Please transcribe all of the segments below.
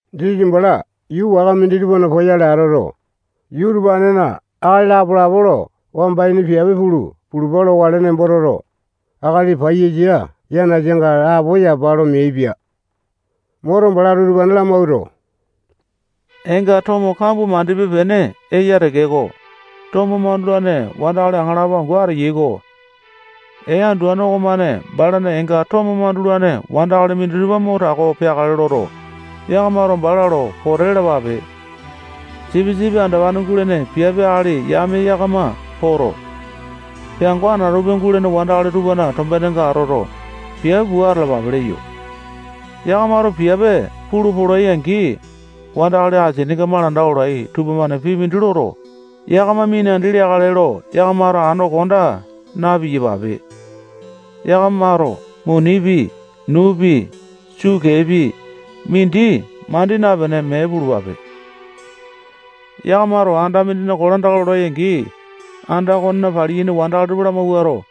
Jisasa bala yuu waka minditupana poyale atoto, yuu utupanena akali lapo-lapo lo wamba ini piape pulu pulupa lokale nembo toto, akali paiyasa yanasanga lapo yapa lo meaipia. Moto, balato utupane lamawuato, eenga tomo kambua mandipe-pene eya tekeko, tomo mandulane wandakali aŋalapo angu ateyai-ko. Ee anduane okomane balana eenga tomo mandulane wandakali minditupa mo tako peakale loto, yakamato bala lo pote lalapape. Sipisipi andopane gulene piape akali yame yakama poto, peango anatope gulene wandakali tupana tombenenga atoto, piape pua atalapape leyo. Yakamato piape pulu polai-angi, wandakali asininga malanda olai tupamane pii mindi loto, yakama minandi leakale lo yakamato ando konda na-piyapape. Yakamato munipi, nuupi, sukeepi, mindi mandi napene, mee pulupape. Yakamato anda mindina kolandaka lolai-angi, anda okonena paliyaini wandakali tupa lamawuato,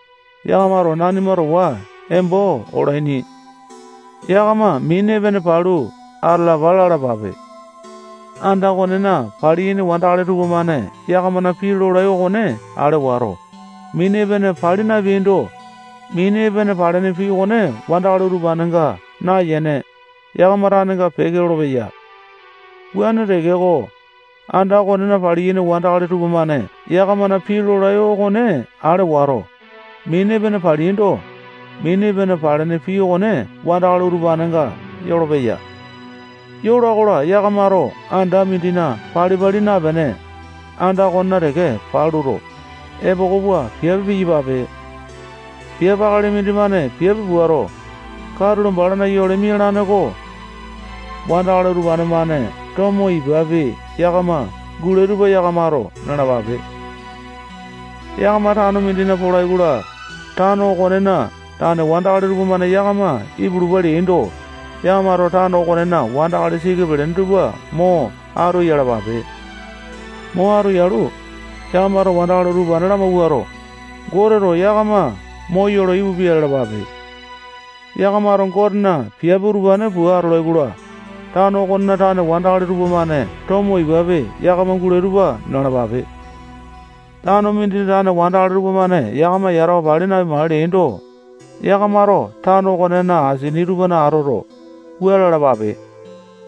yakamato nanima towa embo olaini. Yakama mini epene palu atalapa lalapape. Anda okonena paliyaini wandakali tupamane yakamana pii lolai okone ale wato, mini epene pali napeaindo, mini epene palene pii okone wandakali utupanenga nayene, yakama tanenga peke lolopeya. Wuane tekeko, anda okonena paliyaini wandakali tupamane yakamana pii lolai okone ale wato, mini epene paleaindo, mini epene palene pii okone wandakali utupanenga yolopeya. Yola-kola, yakamato anda mindina pali-pali napene, anda okonena teke paluto, epoko pua piape piyapape. Piape akali mindimane piape puato, katulo balana yole mialane-ko. Wandakali utupane-mane tomo ipapi yakama gulai tupa yakamato nalapape. Yakama tano mindina polai-kola, tano okonena tane wandakali tupamane yakama ipulupa leaindo, yakamato tano okonena wandakali siki pelene tupa mo atu yalapape. Mo atu yalu, yakamato wandakali utupane lamawuato, Goteto yakama moyolo ipupia lalapape. Yakamato Gotena piape utupane pua atolai-kola, tano okonena tane wandakali tupamane tomo ipapi yakama gulai tupa nalapape. Tano mindina tane wandakali tupamane yakama yatawa pali napimakale leaindo, yakamato tano okonena asini tupana atoto, wua lalapape: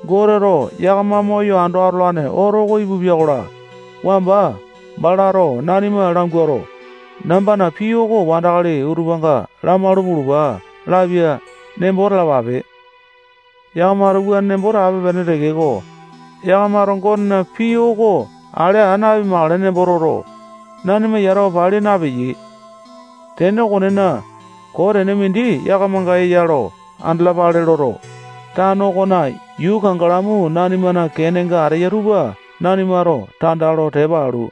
Goteto yakama moyo ando atolane oto oko ipupia-kola, wamba balato nanima languato, nambana pii oko wandakali utupanga lamalu pulupa lapia nembo talapape. Yakamato wuane nembo tape-pene tekeko, yakamato Gotena pii oko ale aa napimakale nembo toto, nanima yatawa pali napeyai. Tene okonena, koo tene mindi yakamanga eya lo andalapale loto, tano okona yuu kangalamu nanimana kenenga ateya tupa nanimato tanda lo tepa alu,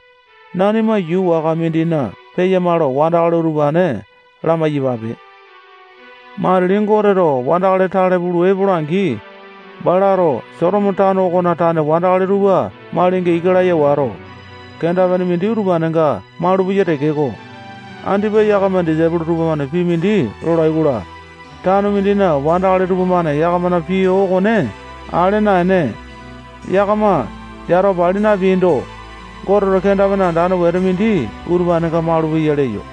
nanima yuu waka mindina peyama lo wandakali utupane lamai-yapape. Matili Goteto wandakali tale pulu epola-angi, balato Sotomo tano okona tane wandakali tupa malinga ika laya wato, kenda-pene mindi utupanenga malupeya tekeko, andipa yakama disaipolo tupamane pii mindi lolai-kola, tano mindina wandakali tupamane yakamana pii okone ale naene, yakama yatawa pali napeaindo, Goteto kenda-pene andane wete mindi utupanenga malupeya leyo.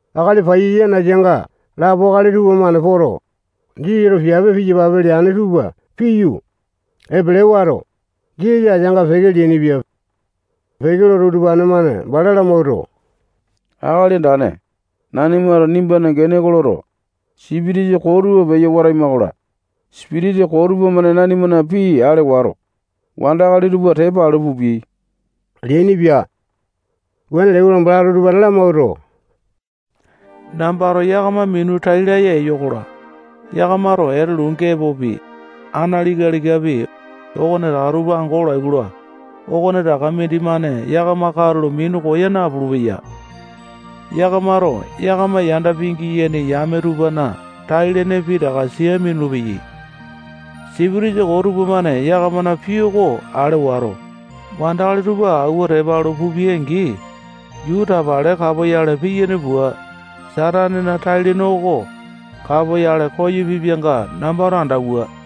Akali paiyasa yanasanga lapo tupamane poto, Jisasato piape piyapape leane tupa piyu, epele wato, Jisasa ateanga peke leainipia. Peke loto, utupane-mane bala lamawuato, Akali Andane, nanimato nimbana gene oko loto, sipitisa koo tupa peyo wataima-kola, sipitisa koo tupamane nanimana pii ale wato, wandakali tupa tepa alu pupiai leainipia. Wuane leai-kola, balato utupane lamawuato, nambato yakama minu tai laya ewa-kola, yakamato etelu gepopi, analika-likapi, okonetaka tupa ango olai-kola, okonetaka mindimane yakama katulo minu koya napulu-peya. Yakamato yakama yanda pingiyaini yame tupana tai-lene pitaka sia minulu-peyai. Sipitisa koo tupamane yakamana pii oko ale wato, wandakali tupa awua tepa alu pupiai-angi, yuu tapale kapoyale piyane pua, Satanena tai-lene oko kapoyale koyo pipianga nambato andauwa.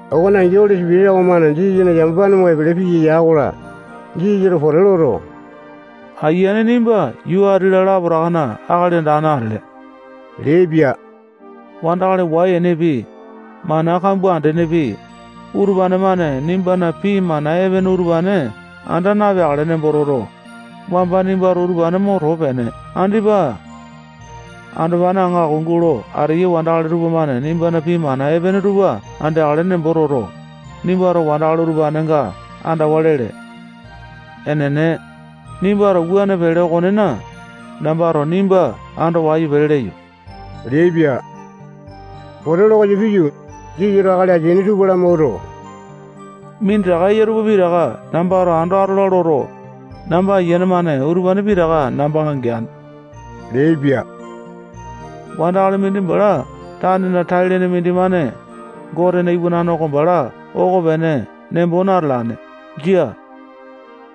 Okone angi, Oli Sipitisa okomane Jisasana yamapane mo epele piya ya-kola, Jisasato pote loto, Ayiane, nimba yuu ati-la lapotakana Akali Andane atele leaipia. Wandakali wai-enepi, mana kambua andenepi, utupane-mane nimbana pii mana epene utupane anda napeakale nembo toto, wamba nimbato utupane mo too peene. Andipa andopane aŋako gulo ateyai wandakali tupamane nimbana pii mana epene tupa andeakale nembo toto, nimbato wandakali utupanenga andawa lele. Enene, nimbato wuane pele okonena, nambato nimba ando wayu pele leyo leaipia. Pote lo koyo piyu, Jisasato akali ateaini tupa lamawuato, minditaka eya tupa pitaka nambato ando atola loto, namba ayiane-mane utupane pitaka nambanga geane leaipia. Wandakali mindi bala tanena tai-lene mindimane Gotena Iwanane oko bala okopene nembo natalane. Jia.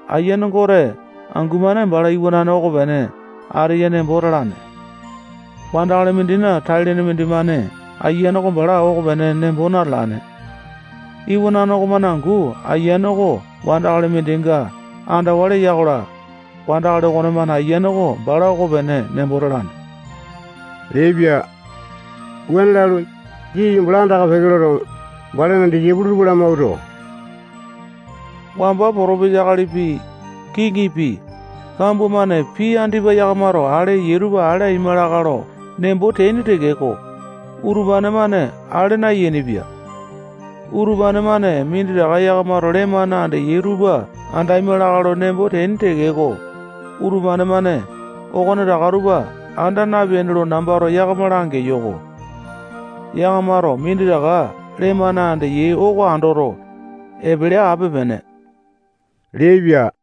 Ayiane Gote angu-mane balana iwanane okopene ateya nembo talane. Wandakali mindina tai-lene mindimane Ayiane oko bala okopene nembo natalane. Iwanane okomane angu ayiane oko wandakali mindinga andawa leya-kola, wandakali okonemane ayiane oko bala okopene nembo talane leaipia. Wuane lalu, Jisasa bala anda-peke loto, balana disaipolo tupa lamawuato, wamba potopesa akalipi, kiŋipi, kambua-mane pii andipa yakamato ale eyai tupa ale aima lakae lo nembo teaini tekeko, utupane-mane ale nayainipia. Utupane-mane minditaka yakamato lee-mane andeyai tupa andaima lakae lo nembo teaini tekeko, utupane-mane okonetaka tupa anda napeaini lo nambato yakama langeyo-ko. Yakamato minditaka lee-mane andeyai oko andoto, epele ape-pene leaipia.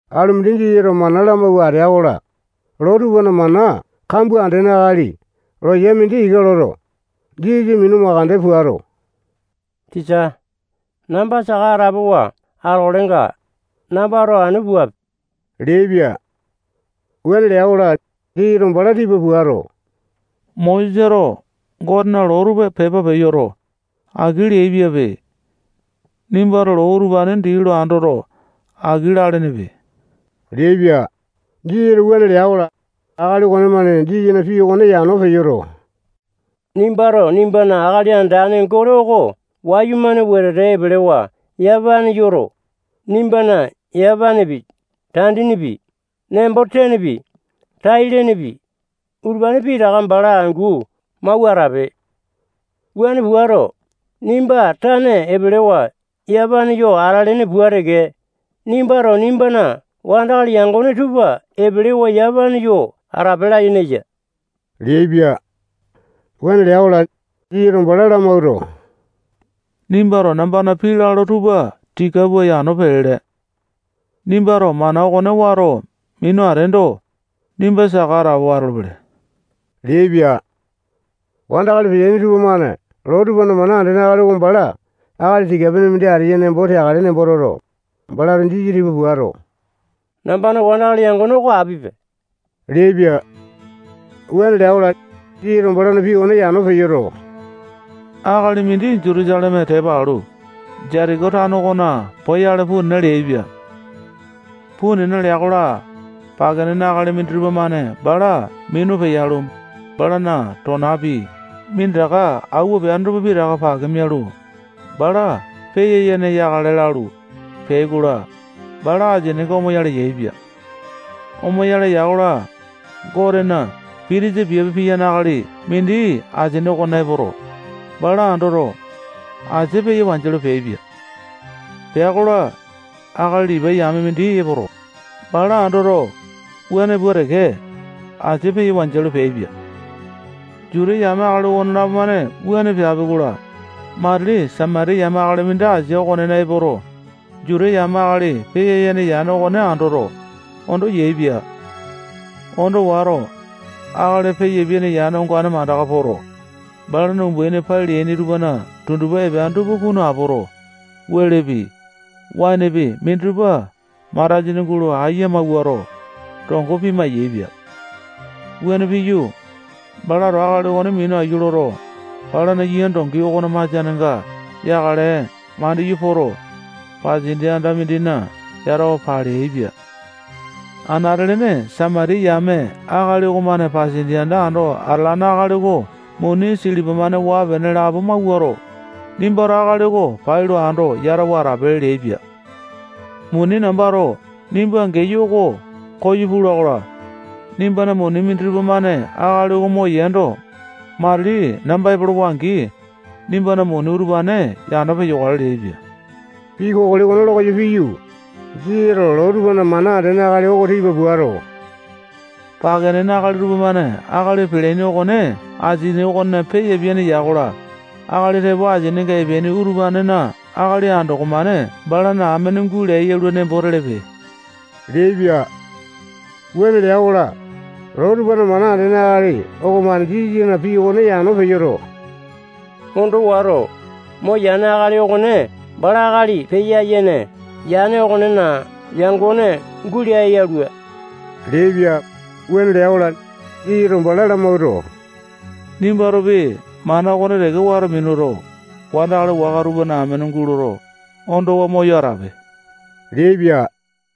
Alu mindi Jisasato mana lamawua atea-kola, loo tupana mana kambua andene akali loya mindi ika loto, Jisasa minu mandeke puato, tisa, namba saka atapowa atokalenga, nambato anu puape leaipia. Wuane lea-kola, Jisasato bala tipa puato, Mosesato Gotena loo tupa pepa peyoto, aki leaipiape. Nimbato loo utupane dii lo andoto, aki lalenepe leaipia. Jisasato wuane lea-kola, akali okomane Jisasana pii okone yano peyoto, nimbato nimbana Akali Andane Gote oko wayumane wetete epelewa yamapane yoto, nimbana yamapanepi, tandinipi, nembo-tenepi, tai-lenepi, utupane pitaka bala angu mawua atape. Wuane puato, nimba tane epelewa yamapane yo atalene pua teke, nimbato nimbana wandakali yangone tupa epelewa yamapane yo atape layene eya leaipia. Wuane lea-kola, Jisasato bala lamawuato, nimbato nambana pii lalo tupa tika pua yano pelele. Nimbato mana okone wato minu ateendo, nimba saka atapowa atolopele leaipia. Wandakali peteaini tupamane loo tupana mana andene akali oko bala akali tika-pene mindi ateya nembo teakale nembo toto, balato Jisasa tipa puato, nambana wandakali yangone oko apipe leaipia. Wuane lea-kola, Jisasato balana pii okone yano peyoto, alumindi Juta yame akali mindi Jutusaleme tepa alu, Jetiko tano okona poyale puu nena leaipia. Puu nena lea-kola, pake nene akali minditupa-mane bala minu peyalu, balana tonapi, minditaka awua peane tupa pitaka pake mialu, bala peya-yene yakale lalu, peai-kola, bala asininga omoyale yaepia. Omoyale ya-kola, Gotena pitisa piape piyane akali mindi asia okonena epoto, bala andoto, asia peya wanjialu, peaipia. Pea-kola, akali Lipai yame mindi epoto, bala andoto, wuane pua teke, asia peya wanjialu, peaipia. Juta yame akali okonelapo-mane wuane peapi-kola, matili Samatiya yame akali mindi asia okonena epoto, Juta yame akali peyapiane yane okone andoto, ondo yaepia. Ondo wato, akali peyapiane yane ongane mandaka poto, balana umbaini pai leaini tupana tundupa epeane tupa kunu apoto, welepi, waenepi, minditupa matasini gulo ayia mawuato, tongo pima-yaepia. Wuane piyu, balato akali okone minaiyu loto, balana yia dongi okona masianenga yakale mandiyu poto, pasindia anda mindina yatawa paleaipia. Anate-lene Samatiya yame akali okomane pasindia anda ando atalane akali oko muni silipa-mane waa-pene lapo mawuato, nimbato akali oko pailo ando yatawa atape leaipia. Muni nambato nimba geyo oko koyo pula-kola, nimbana muni minditupa-mane akali oko moyeendo, matili namba peke lolowa-angi, nimbana muni utupane yano peyokale leaipia. Pii kokoli okone lo koyo piyu, Jisasato loo tupana mana andene akali oko tipa puato, pake nene akali tupamane akali peleaini okone asini okonena peya-yene ya-kola, akali tepo asininga epeaini utupanena akali andoko-mane balana amene gulea yalua nembo telepe leaipia. Wuane lea-kola, loo tupana mana andene akali okomane Jisasana pii okone yano peyoto, ondo wato, moyane akali okone bala akali peya-yene yane okonena yangone gulea yalua leaipia. Wuane lea-kola, Jisasato bala lamawuato, nimbatopi mana okone teke wato minuto, wandakali waka tupana amene guloto, ondowa moyo atape leaipia.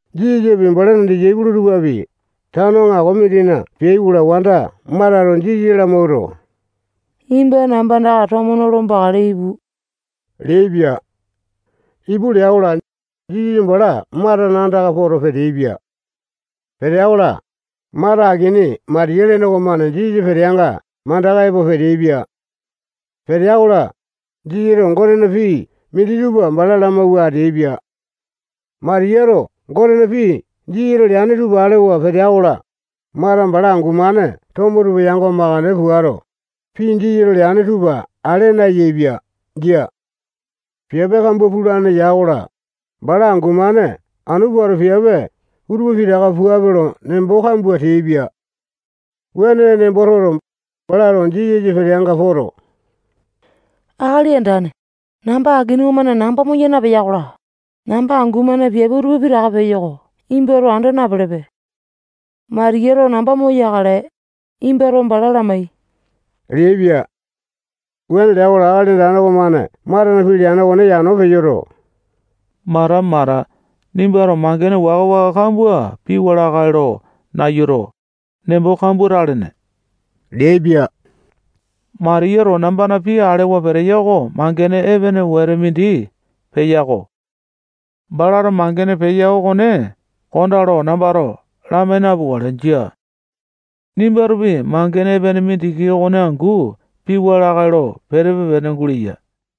Jisasapi, balana disaipolo tupapi, tano aŋako mindina peai-kola, wanda Matato Jisasa lamawuato, nimba namba andaka tomo nolo bakale ipu leaipia. Ipu lea-kola, Jisasa bala Matana andaka poto, peteaipia. Petea-kola, Mata akini Matiya lene okomane Jisasa peteanga mandaka epo peteaipia. Petea-kola, Jisasato Gotena pii minditupa bala lamawua ateaipia. Matiyato Gotena pii Jisasato leane tupa alewa petea-kola, Mata bala angu-mane tomo tupa yango mandeke puato, pii Jisasato leane tupa ale nayaepia. Jia. Piape kambua pulane ya-kola, bala angu-mane anu puato piape utupa pitaka puape lo, nembo kambua teaipia. Wuane nembo toto, balato Jisasa peteanga poto, Akali Andane, namba akini okomane namba moya napeya-kola, namba angu-mane piape utupa pitaka peyo oko nimbato anda napelepe. Matiyato namba moyakale, nimbato bala lamai leaipia. Wuane lea-kola, Akali Andane okomane Matana pii leane okone yano peyoto, Mata, Mata, nimbato mangene waka-waka kambua piwa lakae lo nayuto, nembo kambua talene leaipia. Matiyato nambana pii alewa peteya oko mangene epene wete mindi peya-ko. Balato mangene peya okone kondaa lo nambato lamai napukale. Jia. Nimbatopi mangene epene mindiki okone angu piwa lakae lo petepe-pene guleya.